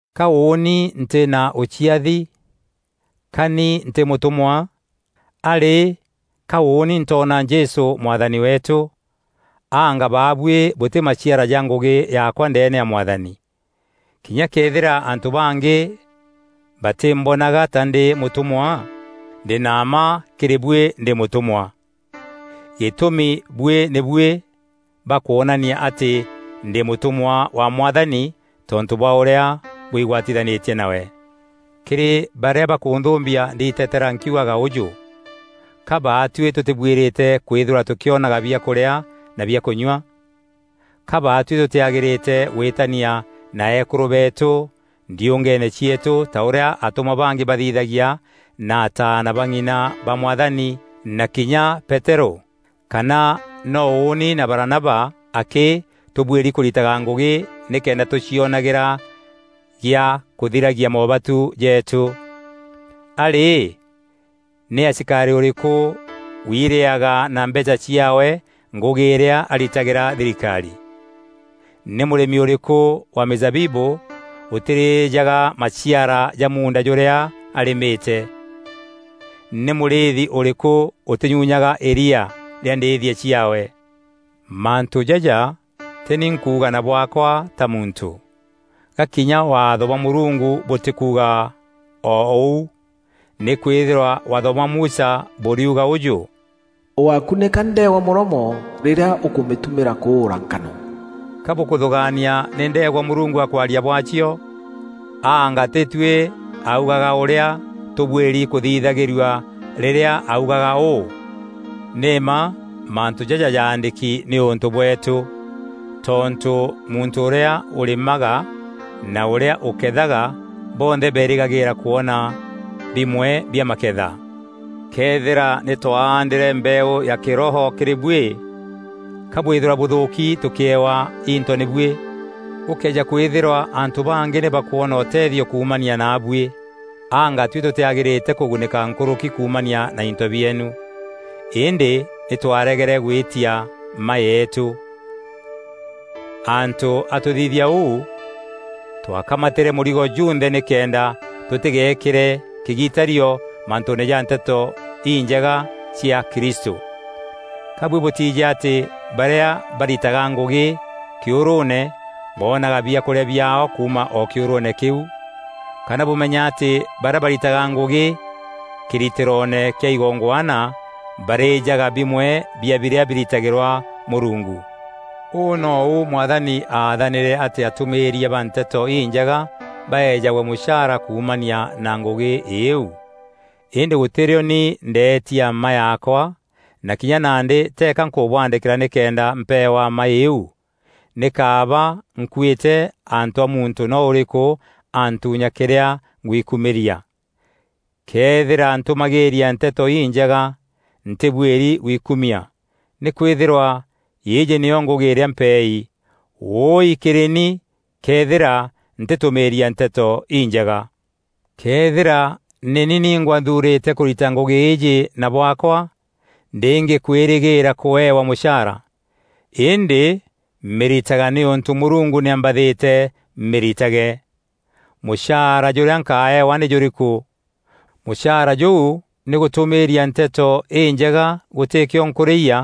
Ka ûûni ntî na ûciathi? Ka ni ntî mûtûmwa? A rî, ka ûûni ntoona Jesû Mwathani weetû? Anga baabuî bûtî maciara ja ngûgî yaakwa ndeene ya Mwathani? Kinya këethîra antû bangî batîmbonaga ta ndî mûtûmwa, ndî na mma kîrî buî ndî mûtûmwa. Gîtûmi buî nî buî ba kwonania atî ndî mûtûmwa wa Mwathani tontû bwa ûrîa bwigwatithanîtie nawe. Kîrî barîa bakûnthûmbia ndiitetera nkiugaga ûjû: Ka baatuî tûtîbuîrîte kwîthîrwa tûkîonaga biakûrîa na bia kûnyua? Ka baatuî tûtîagîrîte gwîtania na eekûrû beetû ndiûngeene cieetû ta ûrîa atûmwa bangî bathithagia na ataana ba ng'ina ba Mwathani na kinya Peterû? Kana no ûûni na Baranaba akî tûbuîri kûritaga ngûgî nîkenda tûcionagîra gîa kûthiragia moobatu jeetû? A rî, nî asikarî ûrîkû wiireaga na mbeecha ciaawe ngûgî îrîa aritagîra thirikarî? Nî mûrîmi ûrîkû wa mîzabibû ûtîrîjaga maciara ja muunda jûrîa arîmîte? Nî mûrîîthi ûrîkû ûtînyunyaga îria rîa ndîîthia ciaawe? Mantû jaja tî ni nkuuga na bwaakwa ta muntû. Ga kinya Waatho bwa Mûrungu bûtîkuuga oo ûu? Nîkwîthîrwa Waatho bwa Musa bûriuga ûjû, “Ûgákunîka ndeegwa mûromo rîrîa ûkûmîtumîra kûûra nkano.” Ka bûkûthûgaania nî ndeegwa Mûrungu akwaria bwaacio? Anga tîtuî augaga ûrîa tûbuîri kûthithagîrua rîrîa augaga ûû? Nî mma mantû jaja jaandîki nîûntû bweetû. Tontû muntû ûrîa ûrîmaga na ûrîa ûkethaga bonthe beerîgagîîra kwona bimwe bia maketha. Këethîra nî twaandîre mbeeû ya kîroho kîrî buî, ka bwîthîrwa bûthûûki tûkîewa into nî buî? Gûkëeja kwîthîrwa antû bangî nî bakwona ûtethio kuumania naabuî, anga tuî tûtîagîrîte kûgunîka nkûrûki kuumania na into bieenu? Îndî nî twaregere gwîtia mma yeetû. Antû a tûthithia ûu, twakamatîre mûrigo junthe nîkenda tûtîgeekîre kîgitario mantûûne ja Nteto Injega cia Kristû. Ka buî bûtiijî atî barîa baritaga ngûgî kîûrûûne, boonaga biakûrîa biaao kuuma o kîûrûûne kîu? Kana bûmenya atî barîa baritaga ngûgî kîritîroone kîa igongwana barîjaga bimwe bia birîa biritagîrwa Mûrungu. Ûû nou Mwathani aathanîre atî atûmîîria ba Nteto Injega baejagwe mûchaara kuumania na ngûgî îîu. Îndî gûtî rîo ni ndeetia mma yaakwa na kinya nandî teeka nkûbûandîkîra nîkenda mpeewa mma îîu. Nî kaaba nkuîte antû a muntû no ûrîkû antuunya kîrîa ngwikûmîria. Këethîra ntûmagîîria Nteto Injega, ntîbuîri gwikumia. Nîkwîthîrwa îîjî nîyo ngûgî îrîa mpeei. Wûi kîrî ni këethîra ntîtûmîîria Nteto Injega! Këethîra nî ni ningwa nthuurîte kûrita ngûgî îîjî na bwaakwa, ndîngî kwîrîgîîra kûewa mûchaara. Îndî mîritaga nîûntû Mûrungu nî ambathîte mîritage. Muchaara jûrîa nkaeewa nî jûrîkû? Mûcaara jûu nî gûtûmîîria Nteto Înjega gûtîkîo nkûrîyia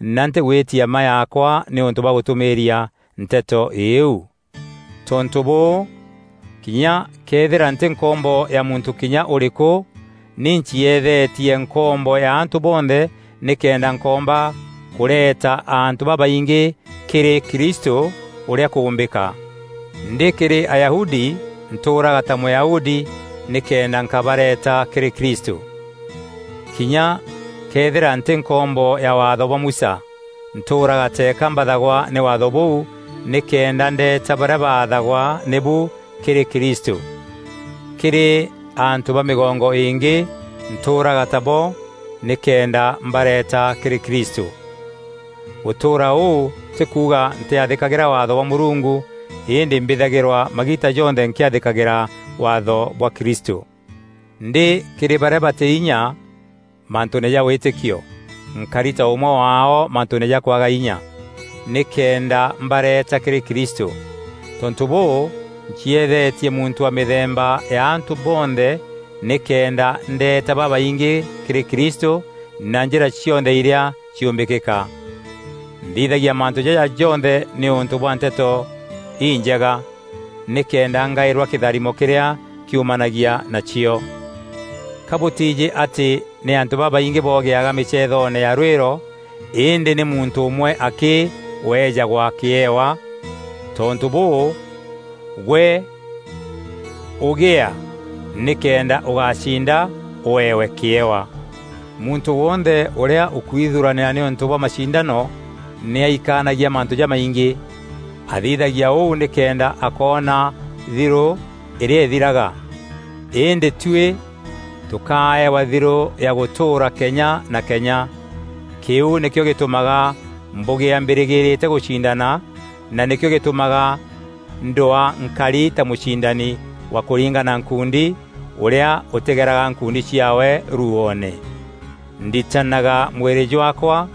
na ntîgwîtia mma yaakwa nîûntû bwa gûtûmîîria Nteto îîu. Tontû bûû, kinya këethîra ntî nkombo ya muntû kinya ûrîkû nî ncieethetie nkombo ya antû bonthe nîkenda nkoomba kûreeta antû babaingî kîrî Kristû ûrîa kûûmbîka. Ndî kîrî Ayahudi, ntûûraga ta Mûyahudi nîkenda nkabareeta kîrî Kristû. Kinya këethîra ntî nkombo ya Waatho bwa Musa, ntûûraga teeka mbathagwa nî Waatho bûu nîkenda ndeeta barîa baathagwa nîbu kîrî Kristû. Kîrî antû ba mîgongo îngî, ntûûraga tabo nîkenda mbareeta kîrî Krîstû. Gûtûûra ûû tî kuuga ntîathîkagîra Waatho bwa Mûrungu îndî mbîthagîrwa magiita jonthe nkîathîkîra waatho bwa Kristû. Ndî kîrî barîa batî inya mantûûne ja wîtîkio, nkari ta ûmwe waao mantûûne ja kwaga inya, nîkenda mbareeta kîrî Kristû. Tontû bûû, ncieethetie muntû wa mîthemba ya antû bonthe nîkenda ndeeta babaingî kîrî Kristû na njîra cionthe irîa ciûmbîkîka. Nthithagia mantû jaja jonthe nîûntû bwa Nteto Injega, nîkenda ngaîrwa kîtharimo kîrîa kiumanagia nacio. Ka bûtiijî atî nî antû babaingî bogîaga mîceethoone ya rwîro îndî nî muntû ûmwe akî ûeejagwa kîewa? Tontû bûû, gwe ûgîaa nîkenda ûgacinda ûeewe kîewa. Muntû wonthe ûrîa ûkwithuranîra nîûntû bwa macindano nî aikanagia mantû jamaingî. Athithagia ûu nîkenda akoona thirû îrîa îthiraga. Îndî tuî tûkaeewa thirû ya gûtûûra kenya na kenya. Kîu nîkîo gîtûmaga mbûgîa mbîrîgîîrîte gûcindana na nîkîo gîtûmaga ndwaa nkari ta mûcindani wa kûringana nkuundi ûrîa ûtîgeraga nkuundi ciaawe ruuoone. Nditanaga mwîrî jwaakwa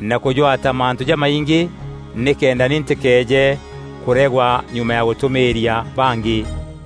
na kûjwata mantû jamaingî nîkenda ni ntîkeeje kûregwa nyuma ya gûtûmîîria bangî.